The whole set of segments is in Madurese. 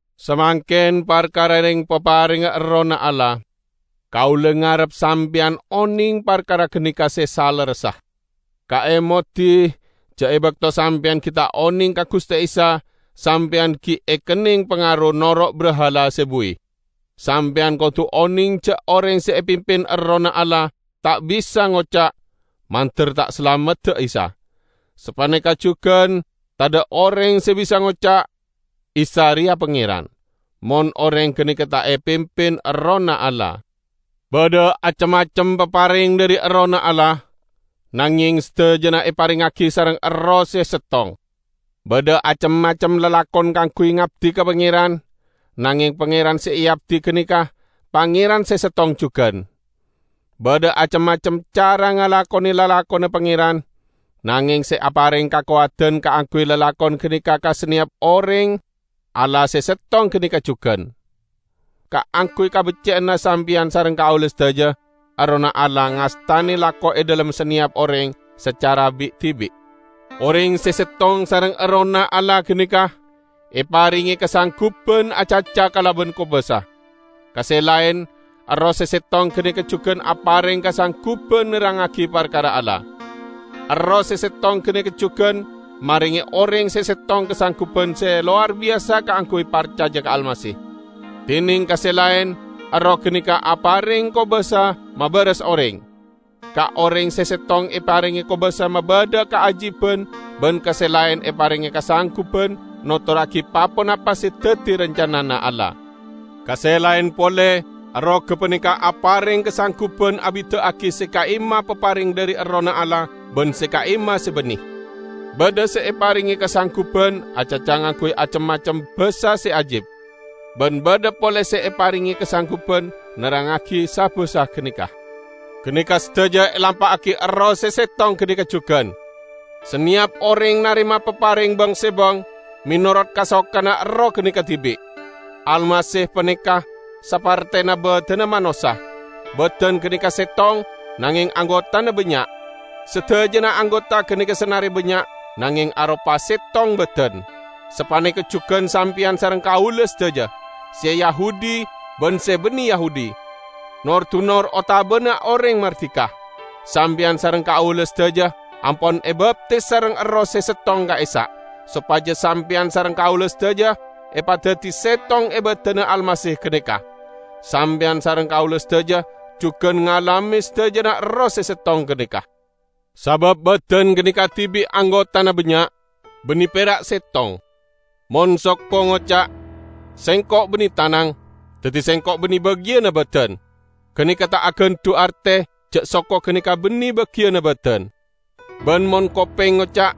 Samangken parkara reng-paparengnga Errohna Allah. Kaula ngarep sampeyan oneng parkara ganeka se salerressa. Kaemodi ja' e bakto sampeyan gi' ta' oneng ka Guste Isa, sampeyan gi' ekenneng pangaro noro' brahala se buwi. Sampeyan kodu oneng ja' oreng se epimpin Errohna Allah ta' bisa ngoca', "Mandar ta' salamedda Isa!" Sapaneka jugan tadha' oreng se bisa ngoca', "Isa reya Pangeran," mon oreng ganeka ta' epimpin Errohna Allah. Badha acem-macem papareng dhari Errohna Allah, nangeng sadajana eparengngagi sareng Erroh se settong. Badha acem-macem lalakon kaangguy ngabdi ka Pangeran, nangeng Pangeran se eabdi ganeka, Pangeran se settong jugan! Badha acem-macem cara ngalakone lalakonna Pangeran, nangeng se apareng kakowadan kaangguy lalakon ganeka ka saneyap oreng Allah se settong ganeka jugan. Kaangguy kabecce'anna sampeyan sareng kaula sadaja, Errohna Allah ngastane lako e dhalem saneyap oreng sacara bi'-dibi'. Oreng se settong sareng Errohna Allah ganeka eparenge kasangguban acaca kalaban kobasa. Ka se laen Erroh se settong ganeka jugan apareng kasangguban nerrangngagi parkara Allah. Erroh se settong ganeka jugan marenge oreng se settong kasangguban se lowar biyasa kaangguy parcaja ka Almasih; dineng ka se laen Erroh ganeka apareng kobasa mabaras oreng. Ka oreng se settong eparenge kobasa mabadha kaajiban ban ka se laen eparenge kasangguban notorragi pa-ponapa se daddi rancanana Allah. Ka se laen pole Erroh gapaneka apareng kasangguban abida'agi se ka'imma papareng dhari Errohna Allah ban se ka'imma se banne. Badha se eparenge kasangguban acaca ngangguy acem-macem basa se ajib, ban badha pole se eparenge kasangguban nerrangngagi sa-basa ganeka. Ganeka sadaja elampa'agi Erroh se settong ganeka jugan; saneyap oreng narema papareng bang-sebang menorot kasokanna Erroh ganeka dibi'. Almasih paneka sapertena badanna manossa; badan ganeka settong, nangeng anggotana bannya'. Sadajana anggota ganeka sanare bannya', nangeng aropa settong badan. Sapaneka jugan sampeyan sareng kaula sadaja, se Yahudi ban se banne Yahudi, nor-dunor otabana oreng mardika; sampeyan sareng kaula sadaja ampon ebaptis sareng Erroh se settong ka'issa', sopaja sampeyan sareng kaula sadaja epadaddi settong e badanna Almasih ganeka. Sampeyan sareng kaula sadaja jugan ngalame sadajana Erroh se settong ganeka. Sabab badan ganeka dibi' anggotana bannya', banne pera' settong. Mon soko ngoca', "Sengko' banne tanang, daddi sengko' banne bagiyanna badan," ganeka ta' agandhu' arte ja' soko ganeka banne bagiyanna badan. Ban mon kopeng ngoca'.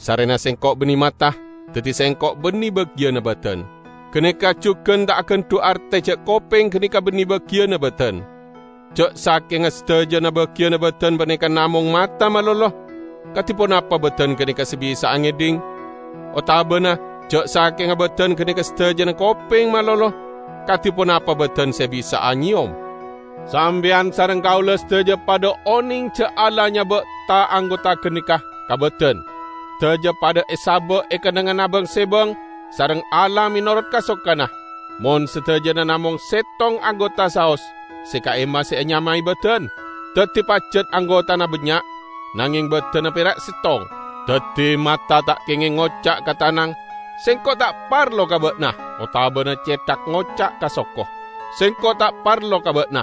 "Sarrena sengko' banne mata, daddi sengko' banne bagiyanna badan," ganeka jugan ta' agandhu' arte ja' kopeng ganeka banne bagiyanna badan. Ja' sakenga sadajana bagiyanna badan paneka namong mata malolo, kadi ponapa badan ganeka se bisa'a ngedhing? Otabana ja' sakenga badan ganeka sadajana kopeng malolo, kadi ponapa badan se bisa'a nyeyom? Sampeyan sareng kaula sadaja padha oneng ja' Allah nyaba' ta-anggota ganeka ka badan. Sadaja padha esaba' e kennengnganna bang-sebang sareng Allah menorot kasokanna. Mon sadajana namong settong anggota saos, se ka'imma se enyamae badan? Daddi pajat anggotana bannya', nangeng badanna pera' settong. Daddi, mata ta' kengeng ngoca' ka tanang, "Sengko' ta' parlo ka ba'na!" otabana cethak ngoca' ka soko, "Sengko' ta' parlo ka ba'na!"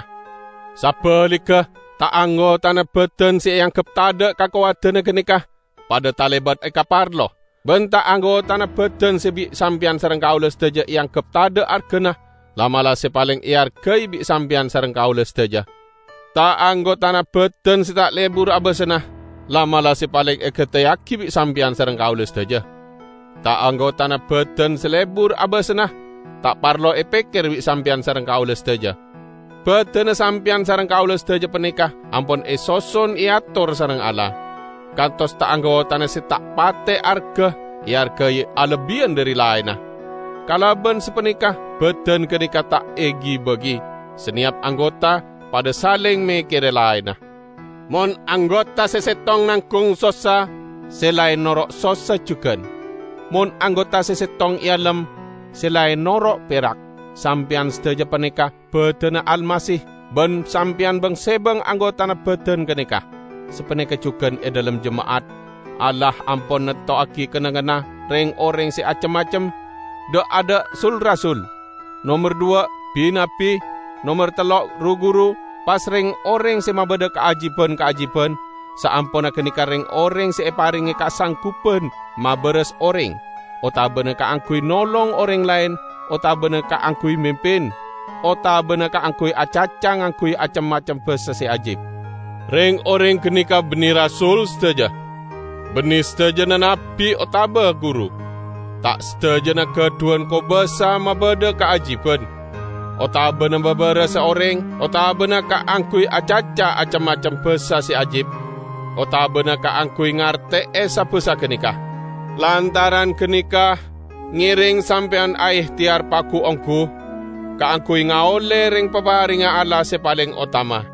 Sabaligga, ta-anggotana badan se eanggep tadha' kakowadanna ganeka, padha talebat ekaparlo; ban ta-anggotana badan se bi' sampeyan sareng kaula sadaja eanggep tadha' argana, la'-mala' se paleng eargai bi' sampeyan sareng kaula sadaja. Ta-anggotana badan se ta' lebur abasanna, la'-mala' se paleng egateyagi bi' sampeyan sareng kaula sadaja. Ta-anggotana badan se lebur abasanna, ta' parlo epekker bi' sampeyan sareng kaula sadaja. Badanna sampeyan sareng kaula sadaja paneka ampon esoson eator sareng Allah, kantos ta-anggotana se ta' pate arga eargai alebbiyan dhari laenna. Kalaban sapaneka badan ganeka ta' egibagi; saneyap anggota padha saleng mekkere laenna. Mon anggota se settong nanggung sossa, se laen noro' sossa jugan; mon anggota se settong ealem, se laen noro' perak. Sampeyan sadaja paneka badanna Almasih, ban sampeyan bang-sebang anggotana badan ganeka. Sapaneka jugan e dhalem jema'at, Allah ampon nantowagi kennengnganna reng-oreng se acem-macem: dha'-adha' sul-rasul; nomer dhuwa' bi-nabbi, nomer tello' ru-guru, pas reng-oreng se mabadha kaajiban-kaajiban, saamponna ganeka reng-oreng se eparenge kasangguban mabaras oreng, otabana kaangguy nolong oreng laen, otabana kaangguy mimpin, otabana kaangguy acaca ngangguy acem-macem basa se ajib. Reng-oreng ganeka banne rasul sadaja, banne sadajana nabbi otaba guru. Ta' sadajana gadhuwan kobasa mabadha kaajiban, otabana mabarasa oreng, otabana kaangguy acaca acem-macem basa se ajib, otabana kaangguy ngarte'e sa-basa ganeka. Lantaran ganeka, ngereng sampeyan aehteyar pagu-onggu kaangguy ngaolle reng-paparengnga Allah se paleng otama.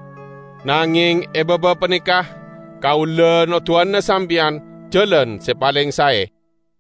Nangeng e baba paneka kaula noduwana sampeyan jalan se paleng sae.